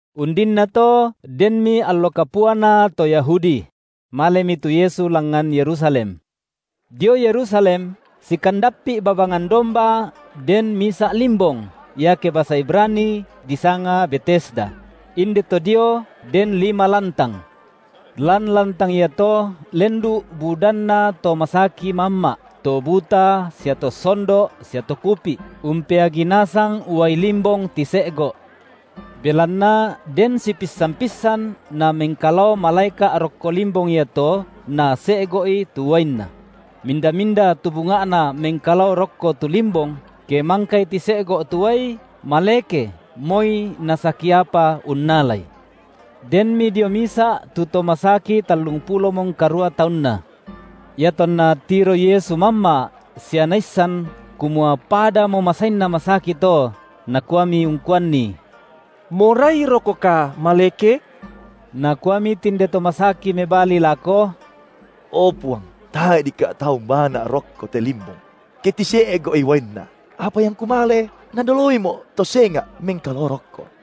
Undinnato denmi allo kapuana to Yahudi; malemi tu Yesu langngan Yerusalem. Dio Yerusalem sikandappi’ babangan Domba den misa’ limbong, iake basa Ibrani disanga Betesda; inde to dio den lima lantang. Lan lantang iato lendu’ budanna to masaki mamma’, to buta sia to sondo’ sia to kupi’, umpeagi nasang uai limbong tise’go’. Belanna den sipissan-pissan namengkalao malaeka’ rokko limbong iato nase’go’i tu uainna; minda-minda tu bunga’na mengkalao rokko tu limbong, ke mangkai tise’go’ tu uai, maleke moi nasaki apa unnalai. Denmi dio misa’ tu to masaki tallungpulomo ngkarua taunna. Iatonna tiroi Yesu mamma’, sia Naissan, kumua padamo masainna masaki to, Nakuami ungkuanni: Morairokoka maleke? Nakuami tinde to masaki mebali lako: O Puang, tae’ dikka’ tau umbaana’ rokko te limbong, ke tise’go’i uainna, apa iangku male, nadoloimo’ to senga’ mengkalao rokko.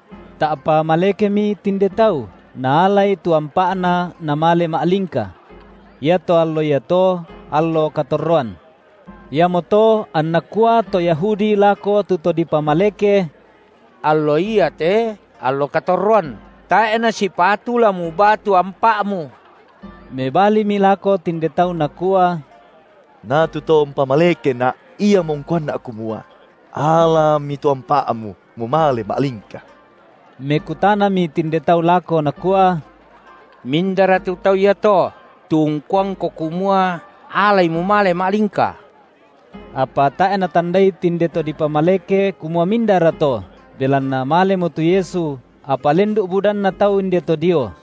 Ta’pa malekemi tinde tau, naalai tu ampa’na namale ma’lingka. Iato allo iato, allo katorroan. Iamoto anna kua to Yahudi lako tu to dipamaleke: Allo iate allo katorroan, tae’ nasipatu la mubaa tu ampa’mu. Mebalimi lako tinde tau nakua: Na tu To umpamalekena’, Iamo ungkuanna’ kumua: Alami tu ampa’mu, mumale ma’lingka’. Mekutanami tinde tau lako nakua: Mindara tu tau iato, tu ungkuangko kumua: Alai mumale ma’lingka? Apa tae’ natandai tinde to dipamaleke kumua mindara to, belanna malemo tu Yesu, apa lendu’ budanna tau inde to dio.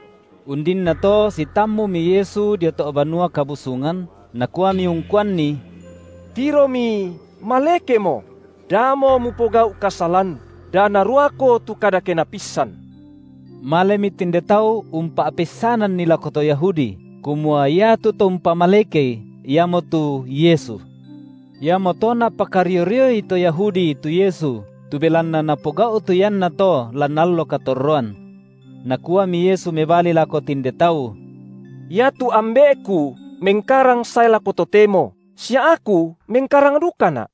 Undinnato sitammumi Yesu dio to’ Banua Kabusungan, Nakuami ungkuanni: Tiromi, malekemoko; damo mupogau’ kasalan, da naruako tu kadakena pissan. Malemi tinde tau umpa’peissananni lako to Yahudi, kumua iatu To umpamalekei iamotu Yesu. Iamoto napakario-rioI to Yahudi tu Yesu tu belanna Napogau’ tu iannato lan allo katorroan. Nakuami Yesu mebali lako tinde tau: Iatu Ambe’Ku mengkarang sae lako totemo sia Aku mengkarang dukaNa’.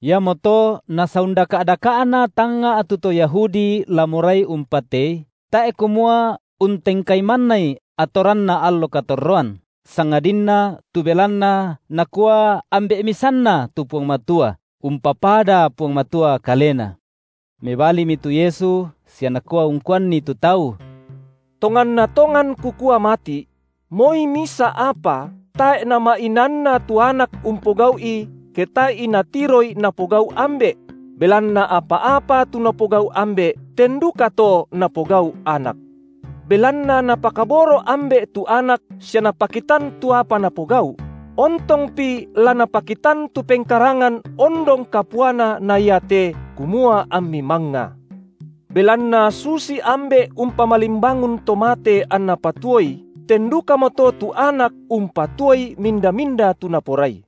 Iamoto nasaundaka’-daka’na tanga’ tu to Yahudi la morai umpatei, tae’ kumua untengkai mannai atoranna allo katorroan, sangadinna tu belanna Nakua Ambe’ misanNa tu Puang Matua, umpapada Puang Matua Kalena. Mebalimi tu Yesu sia nakua ungkuanni tu tau: Tonganna tongan Kukua mati’: Moi misa’ apa tae’ Nama’inaanna tu Anak umpogau’i ke tae’i Natiroi Napogau’ Ambe’; belanna apa-apa tu Napogau’ Ambe’, ten dukato Napogau’ Anak. Belanna Napakaboro’ Ambe’ tu Anak sia Napakitan tu apa Napogau’; ontongpi la Napakitan tu pengkarangan ondong kapuana na iate, kumua ammi mangnga. Belanna susi Ambe’ umpamalimbangun to mate anNa patuoi, ten dukamoto tu Anak umpatuoi minda-minda tu Naporai.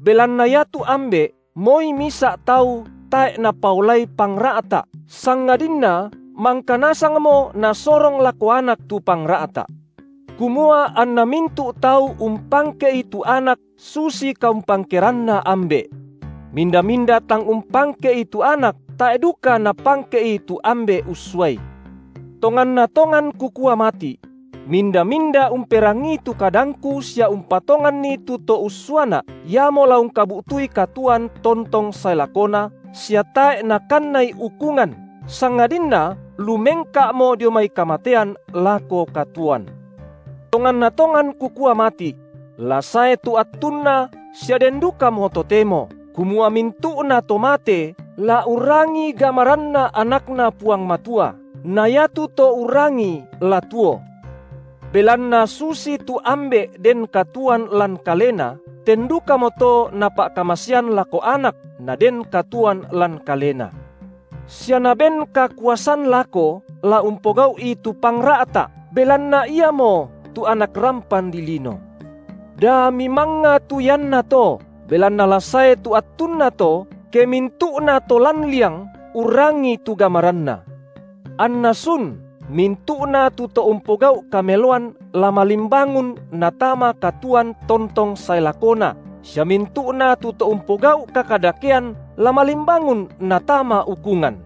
Belanna iatu Ambe’ moi misa’ tau tae’ Napaolai pangra’ta’, sangadinna mangka nasangmo Nasorong lako Anak tu pangra’ta’, kumua anna mintu’ tau umpangke’I tu Anak susitu kaumpangkeranna Ambe’. Minda-minda tang umpangke’I tu Anak, tae’ duka napangke’I tu Ambe’ ussuaI. Tonganna tongan Kukua mati’: Minda-minda umperangii tu kadangKu sia umpatonganNi tu To ussuaNa’, iamo la ungkabu’tui katuoan tontong sae lakona sia tae’ nakannai ukungan, sangadinna lumengka’mo dio mai kamatean lako katuoan. Tonganna tongan Kukua mati’: La sae tu attunna sia den dukamo totemo, kumua mintu’nato mate la urrangi gamaranNa AnakNa Puang Matua, na iatu to urrangii la tuo. Belanna susitu Ambe’ den katuoan lan Kalena, ten dukamoto Napa’kamasean lako Anak naden katuoan lan Kalena. Sia Naben kakuasan lako la umpogau’i tu pangra’ta’, belanna Iamotu Anak rampan dilino. Da mimangnga tu iannato, belanna la sae tu attunna to ke mintu’nato lan liang urrangi tu gamaranNa, anna sun; mintu’na tu to umpogau’ kameloan la malimbangun natama katuoan tontong sae lakona, sia mintu’na tu to umpogau’ kakadakean la malimbangun natama ukungan.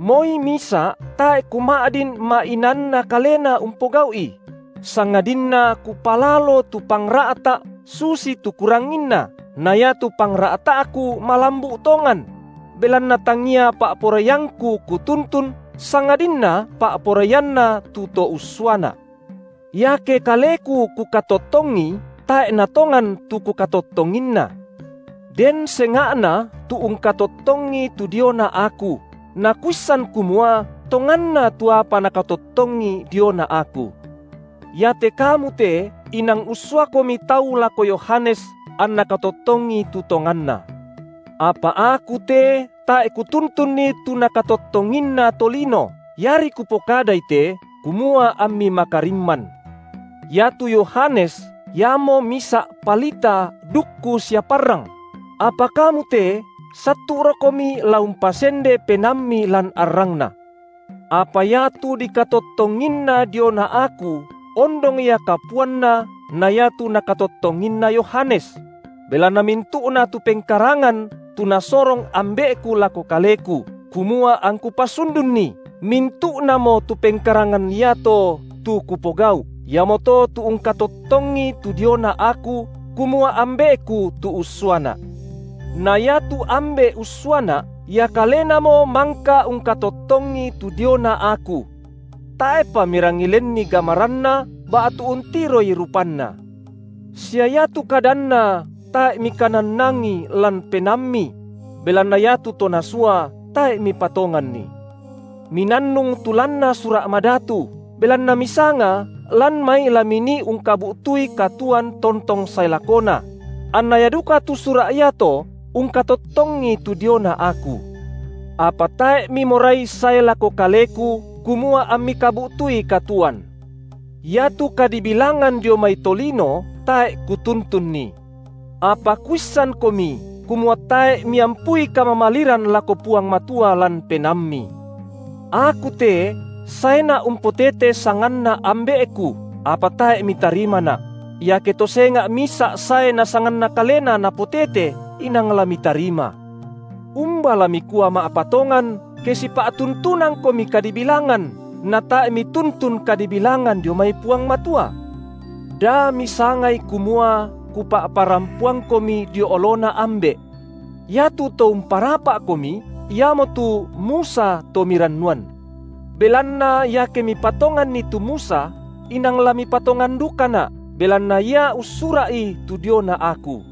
Moi misa’ tae’ Kuma’din ma’inaanna Kalena umpogau’i; sangadinna Kupalalo tu pangra’ta’ susitu Kuranginna, na iatu pangra’ta’Ku malambu’ tongan; belanna tangia pa’poraiangKu Kutuntun, sangadinna pa’poraianNa tu To ussuaNa’. Iake Kaleku Kukatottongi, tae’ natongan tu Kukatottonginna. Den senga’na tu ungkatottongi tu diona Aku, na Kuissan kumua tonganna tu apa Nakatottongi diona Aku. Iate kamu te inang ussuakomi tau lako Yohanes anna katottongi tu tonganna. Apa Aku te tae’ Kutuntunni tu nakatottonginna tolino, iari Kupokadai te, kumua ammi makarimman. Iatu Yohanes iamo misa’ palita dukku sia parrang; apa kamu te sattu’rokomi la umpasende penaammi lan arrangna. Apa iatu dikatottonginna diona Aku ondong Ia kapuanna na iatu nakatottonginna Yohanes; belanna mintu’na tu pengkarangan tu Nasorong Ambe’Ku lako Kaleku, kumua angKu pasundunni, mintu’namo tu pengkarangan iato, tu Kupogau’, iamoto tu ungkatottongi tu diona Aku, kumua Ambe’Ku tu ussuaNa’. Na iatu Ambe’ ussuaNa’, Ia kalenamo mangka ungkatottongi tu diona Aku. Tae’pa mirangi lenni gamaranNa ba’tu untiroi rupanNa, sia iatu kadanNa tae’ mikanannangi lan penaammi; belanna iatu To Nasua, tae’ mipatonganNi. Minannung tu lanna Sura’ Madatu, belanna misanga lan mai la minii ungkabu’tui katuoan tontong sae lakona; anna ia duka tu Sura’ iato ungkatottongi tu diona Aku. Apa tae’ mimorai sae lako Kaleku, kumua ammi kabu’tui katuoan. Iatu kadibilangan dio mai tolino tae’ Kutuntunni; apa Kuissankomi, kumua tae’ miampui kamamaliran lako Puang Matua lan penaammi. Aku te saeNa’ umpotete sanganNa Ambe’Ku, apa tae’ mitarimaNa’; iake to senga’ misa’ sae na sanganna kalena napotete, inang la mitarima. Umba la mikua ma’patongan, ke sipa’tuntunangkomi kadibilangan, natae’ mituntun kadibilangan dio mai Puang Matua? Da misangai kumua Kupa’parampoangkomi dio oloNa Ambe’. Iatu to umparapa’komi iamotu Musa to mirannuan. Belanna iake mipatonganni tu Musa, inang la mipatongan dukaNa’, belanna ia ussura’i tu diona Aku.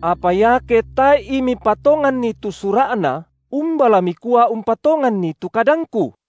Apa iake tae’i mipatonganni tu Sura’na, umba la mikua umpatonganni tu kadangKu?